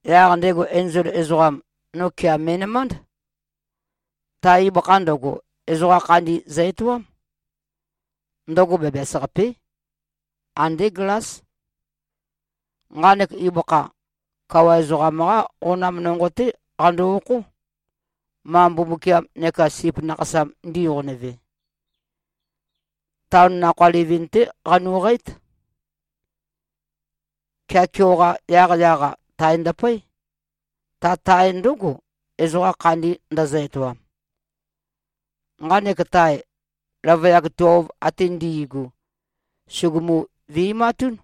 Yaq ndego enzol ezoqam, no kea me꞉nømánd. Ta ibøkha ndøgo, ezoqa khandi zø-etoám. Ndøgo bæbæs-qapé. Andé glás. Nqanek ibøkha, kawa ezoqam-qá qonam nonqo-té qando-okhó, ma Mbumbukiam neka Sip Nakhasam ndiqonøve. Taon nakhoa livin-té qanuqǽt. Kea keoqa yaqyaq-a, tae ndøpøé. Ta tae ndǿgo, ezoqa khandi ndøzø-etoam. Nqanek tae, løvøyak tuelv ate ndi꞉gu, sùgumu-vi꞉matún.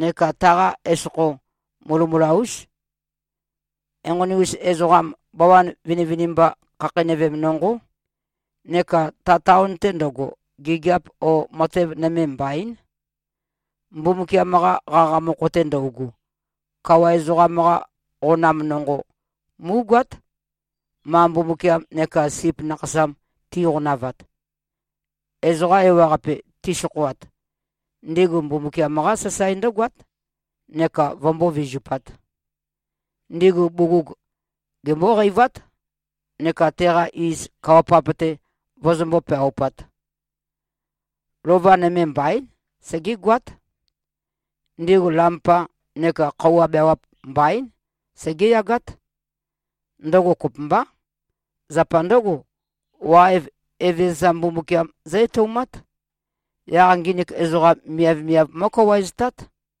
Neka taqa esokho mulømula-ús. Enqoni-us ezoqam bawan vinivinimba khakheinøvem nonqó. Neka ta taon-te ndøgo, gigiap o matev nøme mbaín, Mbumbukiam-qa qaqa mokho-te ndøugu. Kawa ezoqam-qa qonam nonqo, mú꞉goát, ma Mbumbukiam neka Sip Nakhasam tiqonavat. Ezoqa ewaqape, tisokhoat, ndigu Mbumbukiam-qá sasae ndǿgoát neka vømbó-vizupāt. Ndigu bugug gembóqeivát neka teqa iz kawa-pap-te vøzømbó-peaupāt. Lova nøme mbaín. Segégoát. Ndigu lampa neka khøuwa beawap, mbaín. Segéyagát. Ndøgo kopømbá. Zapa ndǿgo, waev, Evezøza Mbumbukiam zǿ-etøumát. Yaq nginik ezoqam, miavmiav mó꞉kawaeztát.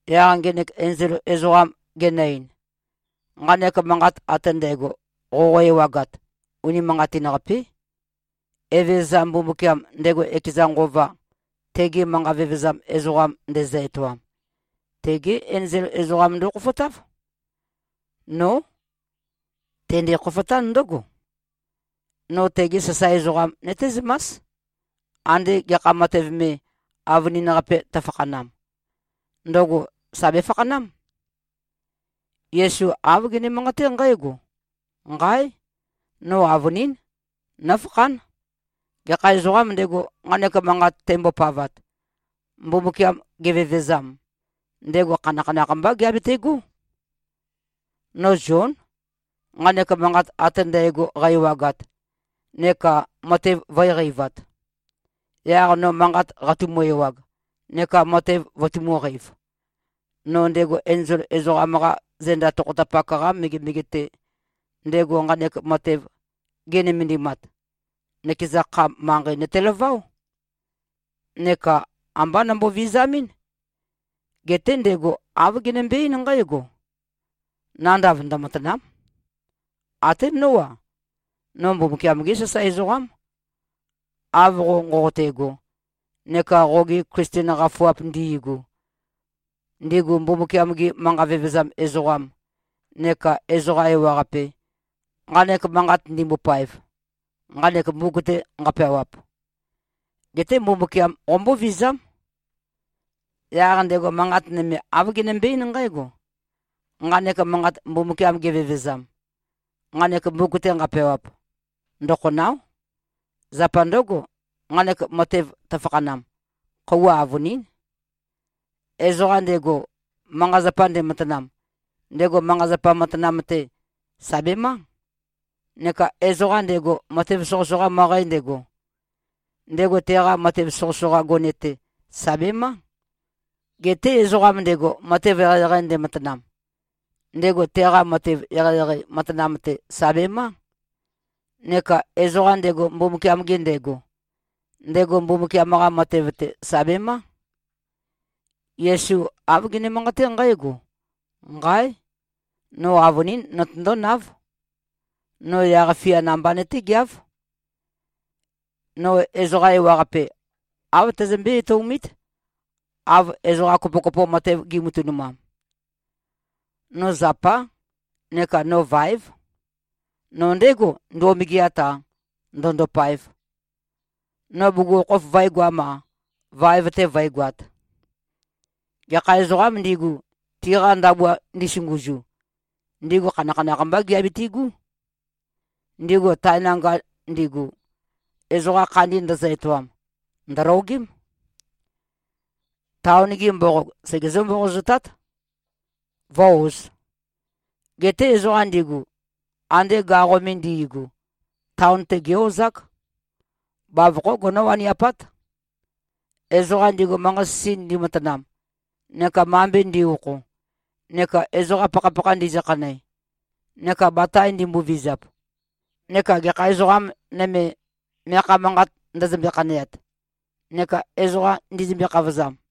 Yaq ngenek enzol ezoqam genø-ein, “Nqanek manqat ate ndægo, qoqo-ewagat, unimanqatin-qapé. Evezøza Mbumbukiam, ndego ekeza Nqova tegi manqa vevezam ezoqam ndezø-etoam, tegé enzol ezoqam ndokhofotáv. Nó. Tende-khofotán ndǿgo: No tegi sasae ezoqam nøtézømás, ande gekha matev me, avønin-qape tøfakhanam. Ndøgo sà befakhanám.” Yesu āv gene-manqaté nqǽgo, “Nqáe! No avønín nófakhán. Gekha ezoqām ndego, nqanek manqat tembopavat, Mbumbukiam gevevezam, ndego khanakhanakh mbá geabetegó.” No Zión, nqanek manqat ate ndægo qæ-ewagat neka matev vø̄e-qeivat. Yaq no manqat qatumu-ewag neka matev vøtumū-qeiv, no ndego enzol ezoqam-qa zenda tokhotapak-qa megemege-te, ndego nqanek matev ge꞉nømendimat, nøkeza kha, manqei nøtelaváo. Neka ambá nombo-vizamɨ́n. Geté ndego āv genømbe-eín nqǽgo, “Nandav ndømatàna᷄m. Até nó-a, no Mbumbukiam-gé sasae ezoqám, av qo nqoqote꞉go neka qogi Klisten qafuap ndi꞉gu, ndigu Mbumbukiam-gi manqa vevezam ezoqam, neka ezoqa ewaqape, nqanek manqat ndimbopaev, nqanek mbuk-te nqapeawap. Geté Mbumbukiam qombóvizám.” Yaq ndego manqat nøme, āv genømbe-eín nqǽgo, “Nqanek manqat, Mbumbukiam gevevezam, nqanek mbuk-te nqapeawap, ndøkhonào᷄. Zapa ndǿgo, nqanek matev tøfakhanam, khøuwa avønín. Ezoqa ndego, manqa-zapa ndematanam, ndego manqa-zapa matanam-te, sà bemá. Neka ezoqa ndego, matev soqøsoqa møqæ ndego, ndego teqa matev soqøsoqa gone-te, sà bemá. Geté ezoqam ndego, matev eqeieqei ndematanam, ndego teqa matev eqeieqei matanam-te, sà bemá. Neka ezoqa ndego, Mbumbukiam-ge ndego, ndego Mbumbukiam-qa matev-te, sà bemá.” Yesu āv gene-manqaté nqǽgo, “Nqáe! No avønín notøndónáv. No yaq-fiá namba nøtégeáv. No ezoqa ewaqape, āv tæzømbé-etøomít, av ezoqa kopokopo matev gi꞉matønumam. No zapá neka no váev. No ndégo, ndo꞉megeat-a, ndø̄ndōpāēv. No bugukhokhof vø̄egoam-a, vaev-te vǿegoāt. Gekha ezoqām ndigu, tiqa ndabua ndisunguzu, ndigu khanakhanakh mbá giabitigú. Ndigu tae nanga ndigu, ezoqa khandi ndøzø-etoam, ndø̀logém. Taon-gi mboqog, segezǿ-mboqozotát, vǿ-ōz. Geté ezoqa ndigu, ande gaqo me ndi꞉gu, taon-te gé-ozák. Bavokhó gonó-waniapát, ezoqa ndigu, manqa-sisi ndimatanam neka mambe ndi꞉-okho neka ezoqa pakhapakha ndizøkhanæ neka batae ndimbovizap neka gekha ezoqa nøme, meakha manqat ndøzømbe-khaneat neka ezoqa ndizømbe-khavozam.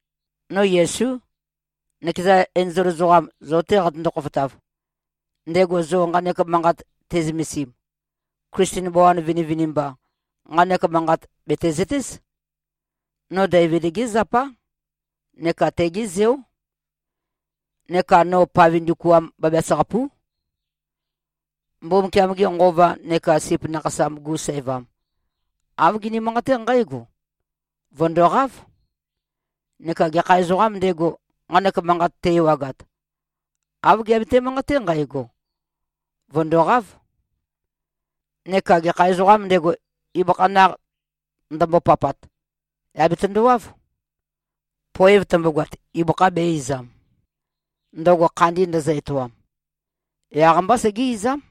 No Yesú, nøkeza enzol ezoqam zo-te qatøndo-khofotav, ndego zo nqanek manqat te꞉zømesim. Klisten bawan vinivinimba, nqanek manqat, bètezøtéz. No Deivid-gé zapá neka tegé zeó. Neka no pave ndukuam bæbæs-qapú.” Mbumbukiam-ge Nqova neka Sip Nakhasam-gu sævam, āv gini-manqaté nqǽgo, “Vø̀ndoqáv!” Neka gekha ezoqām ndego, nqanek manqat te-ewagat, āv geabete-manqaté nqægo, “Vø̀ndoqáv!” Neka gekha ezoqām ndego, ibøkha naq ndømbopapat, yà betøndowáv. Poev tømbogoat, ibøkha bē-izam, ndøgo khandi ndøzø-etoam. Yaq-mbá segé-izám.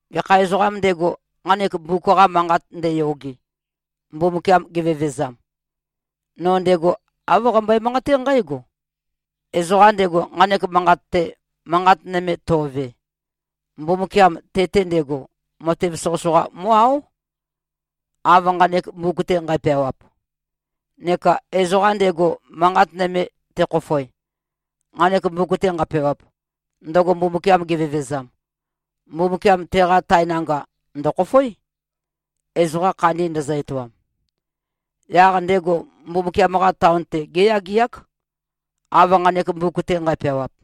Gekha ezoqām ndego, nqanek mbuk-qa manqat ndeyoge, Mbumbukiam gevevezam, no ndego āv qambøe-manqaté nqǽgo: Ezoqam ndego, nqanek manqat-te, manqat nøme to꞉ve, Mbumbukiam te-te ndego, matev soqøsoqa mó꞉-áo, av nqanek mbuk-te nqæpeawap. Neka ezoqa ndego, manqat nøme tekhofoe, nqanek mbuk-te nqapeawap, ndøgo Mbumbukiam gevevezam, Mbumbukiam teqa tae nanga ndø̀khofoé, ezoqa khandi ndøzø-etoam. Yaq ndego Mbumbukiam-qa taon-te géyageák, av nqanek mbuk-te nqæpeawap.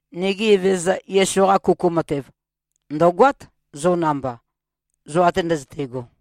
Nigi Evezøza Yesu-qa kuku matev, ndø̀goát, zo namba, zo ate ndøzøte꞉go.